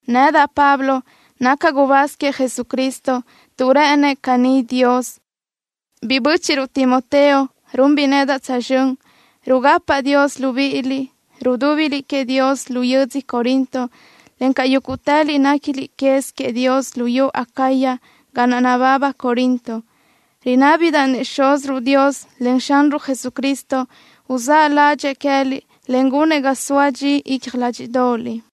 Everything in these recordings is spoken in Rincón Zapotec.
Nedaʼ, Pablo, nacaʼ gubáz queëʼ Jesucristo tuʼ rë́ʼënëʼ caní Dios. Biʼi bö́chiʼruʼ Timoteo runbiʼ nedaʼ tsözxö́n. Rugapaʼ Dios libíʼiliʼ, rudúbiliʼ queëʼ Dios lu yödzö Corinto, encaʼ yúguʼtëliʼ néquiliʼ quez queëʼ Dios luyú Acaya ga naʼ nababa Corinto. Rinábidaʼ-nëʼ Xúziruʼ Dios, en Xanruʼ Jesucristo uzáʼ ládxëʼë queë́liʼ, en gunëʼ ga soa dxi icja ládxiʼdoʼoliʼ.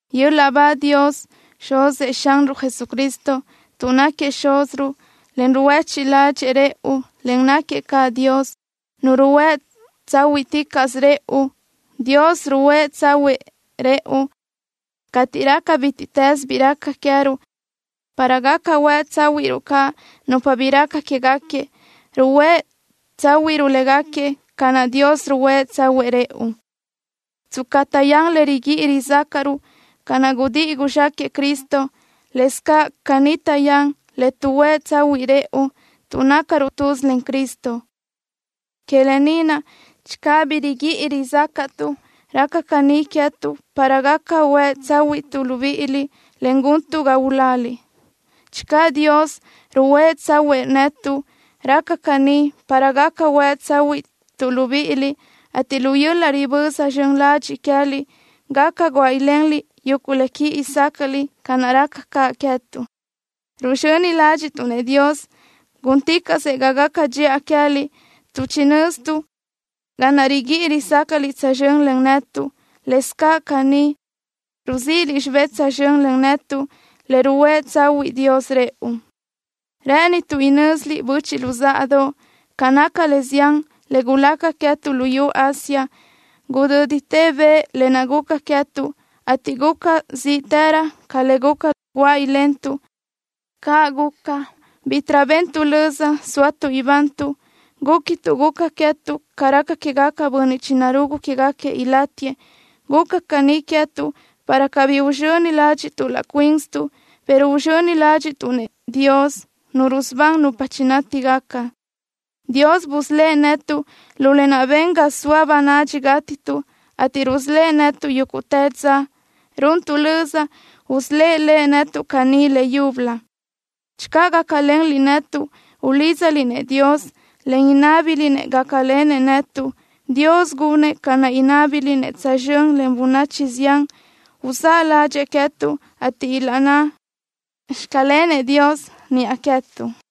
¡Yöl-laʼ ba Dios, Xuzëʼ Xanruʼ Jesucristo, tuʼ náquiëʼ Xúziruʼ, en ruhuéchiʼ ládxëʼë rëʼu, en náquiëʼ caʼ Dios, Nu ruhuë́ tsáhuiʼticaʼsö rëʼu! Dios ruhuë́ tsáhuëʼë rëʼu cateʼ raca bítiʼtës bi raca queë́ruʼ, para gaca huë tsáhuiʼruʼ caʼ nupa bi raca quéguequi. Ruhuë́ tsáhuiʼruʼ légaquiëʼ ca naʼ Dios ruhuë́ tsáhuëʼë rëʼu. Tsca taʼyán le riguíʼi rizácaʼruʼ, ca naʼ gudíʼi guzxáquëʼë Cristo, lëscaʼ caní taʼyán le tuʼhuë́ tsahuiʼ rëʼu, tuʼ nácaruʼ tuz len Cristo. Que lë ni naʼ, channö bi riguíʼi rizácaʼtuʼ, raca caní queë́tuʼ para gaca huë tsáhuiʼtuʼ libíʼiliʼ, en guntuʼ ga uláliʼ. Channö Dios ruhuë́ tsáhuëʼë netuʼ, raca caní para gaca huë tsáhuiʼtuʼ libíʼiliʼ, ateʼ lu yöl-laʼ riböza zxön ladxiʼ queë́liʼ, gaca guáʼ ilenliʼ yuguʼ le quíʼi sácaʼliʼ, ca naʼ raca caʼ queë́tuʼ. Ruzxöni ládxiʼtuʼ-nëʼ Dios gúnticaʼsëʼ ga gaca dxiʼa queë́liʼ, tuʼ chinö́zituʼ ca naʼ riguíʼi rizácaʼliʼ tsözxö́n len netuʼ, lëscaʼ caní ruzíʼiliʼ xibé tsözxö́n len netuʼ le ruhuë́ tsáhuëʼë Dios rëʼu. Rë́ʼënituʼ inö́ziliʼ, böchiʼ luzáʼadoʼ, ca naca le zián le gulaca queë́tuʼ luyú Asia. Gudö́ditë bëʼ lë naʼ guca queë́tuʼ, ateʼ guca zíʼtërö ca le guca guáʼ ilentuʼ. Caʼ guca, bítiʼrö bentuʼ löza sóatuʼ ibantuʼ. Gúquituʼ guca queë́tuʼ ca raca quégaquiëʼ bönniʼ chinarugu quégaquiëʼ ilátiëʼ. Guca caní queë́tuʼ para cabí uzxöni ládxiʼtuʼ laʼ cuínsituʼ, pero uzxöni ládxiʼtuʼ-nëʼ Dios, Nu rusubán nupa chinátigaca. Dios busölë́ʼ netuʼ lu lë naʼ ben ga guzóa bönadxi gátituʼ, ateʼ rusölë́ʼ netuʼ yúguʼtë dza. Runtuʼ löza usölë́ʼ Lëʼ netuʼ caní leyúbölö channö gácalenliʼ netuʼ, ulídzaliʼ-nëʼ Dios, en inábiliʼ-nëʼ gácalenëʼ netuʼ. Dios gunëʼ ca naʼ inábiliʼ-nëʼ tsözxö́n len bönachi zián, uzáʼ ládxëʼë queë́tuʼ, ateʼ ilaʼnná: “Xclenëʼ Dios” niʼa queë́tuʼ.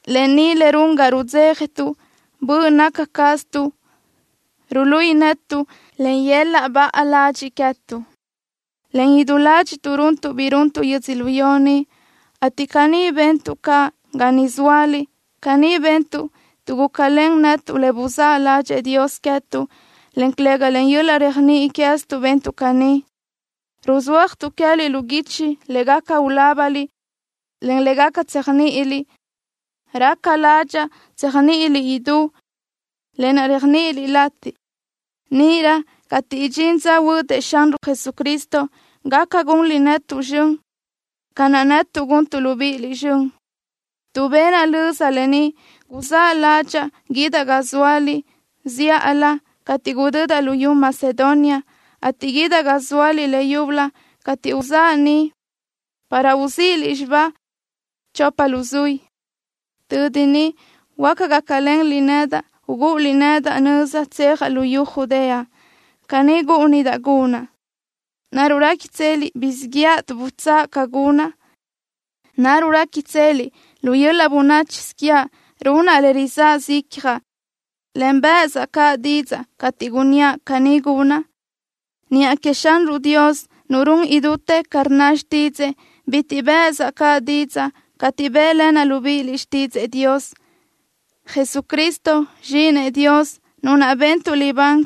Lë ni le run ga rudzéjatuʼ. Böʼ naca caztuʼ ruluíʼi netuʼ, len yöl-laʼ baʼa ladxiʼ queë́tuʼ, en idú ládxiʼtuʼ runtuʼ bi runtuʼ yödzölió ni, ateʼ caní bentuʼ caʼ ga niʼ zóaliʼ. Caní bentuʼ, tuʼ gúcalen netuʼ le buzáʼ ládxëʼë Dios queë́tuʼ, en calëga len yöl-laʼ réajniʼi queë́ztuʼ bentuʼ caní. Ruzúajsötuʼ queë́liʼ lu guichi le gaca ulábaliʼ, en le gaca tséajniʼiliʼ. Raca ládxaʼa tséajniʼiliʼ idú lë naʼ réajniʼiliʼ latiʼ. Níʼirö cateʼ idxín dza huödëʼ Xanruʼ Jesucristo, gaca gunliʼ netuʼ zxön ca naʼ netuʼ guntuʼ libíʼiliʼ zxön. Tuʼ benaʼ löza lë ni, guzáʼ ládxaʼa guídaʼ ga zóaliʼ zíʼalö cateʼ gudödaʼ luyú Macedonia, ateʼ guídaʼ ga zóaliʼ leyúbölö cateʼ uzáʼa ni para uzíʼiliʼ xibáʼ chopa luzuí. Tödi niʼ huáca gácalenliʼ nedaʼ ugúʼuliʼ nedaʼ nöza tsejaʼ luyú Judea. Caní gúʼunidaʼ gunaʼ. ¿Naruʼ réquitseliʼ guzxíʼ yëʼa tuʼ butsáʼa ca gunaʼ? ¿Naruʼ réquitseliʼ lu yöl-laʼ bönáchisö quiaʼ runaʼ le rizáʼasö icjaʼ, en bë́ʼësaʼ caʼ didzaʼ cateʼ gunníaʼ: “Caní gunaʼ”? Niʼa queëʼ Xanruʼ Dios, Nu run idútë ca rnna xtídzëʼë, bitiʼ bë́ʼësaʼ caʼ didzaʼ cateʼ bë́ʼlenaʼ libíʼiliʼ xtídzëʼë Dios. Jesucristo, Zxíʼinëʼ Dios, Nu naʼ bentuʼ libán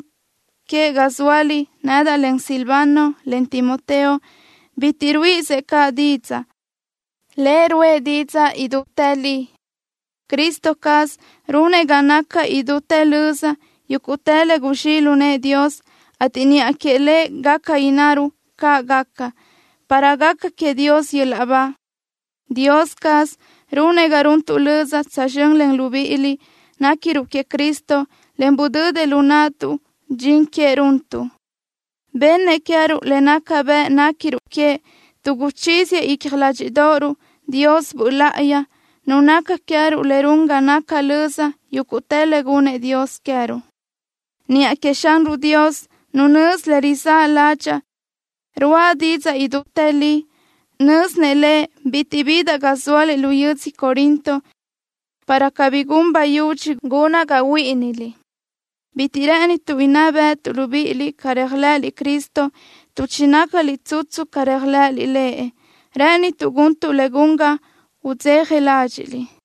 que ga zóaliʼ, nedaʼ len Silvano, en Timoteo, bitiʼ ruíʼisëʼ caʼ didzaʼ. Lëʼ ruʼë didzaʼ idútë li. Cristo caz runëʼ ga naca idútë löza yúguʼtë le guzxíʼ lu nëʼë Dios, ateʼ niʼa queëʼ Lëʼ gaca innaruʼ: “Caʼ gaca”, para gaca queëʼ Dios yöl-laʼ ba. Dios caz runëʼ ga runtuʼ löza tsözxö́n len libíʼiliʼ néquiruʼ queëʼ Cristo, en budödëʼ lu naʼtuʼ dxin queëʼ runtuʼ. Bennëʼ queë́ruʼ le naca bëʼ néquiruʼ queëʼ, tuʼ guchíziëʼ icja ládxiʼdoʼoruʼ Dios Böʼ Láʼayi, Nu naca queë́ruʼ le run ga naca löza yúguʼtë le gunnëʼ Dios queë́ruʼ. Niʼa queëʼ Xanruʼ Dios, Nu nözi le rizáʼ ládxaʼa, ruáʼa didzaʼ idútë li. Nö́zinëʼ Lëʼ bitiʼ bidaʼ ga zóaliʼ lu yödzö Corinto, para cabí gun bayudxi gunaʼ ga huíʼiniliʼ. Bitiʼ rë́ʼënituʼ inná béʼetuʼ libíʼiliʼ ca réajlëʼëliʼ Cristo, tuʼ chinácaliʼ tsutsu ca réajlëʼëliʼ Lëʼ. Rë́ʼënituʼ guntuʼ le gun ga udzeja ládxiʼliʼ.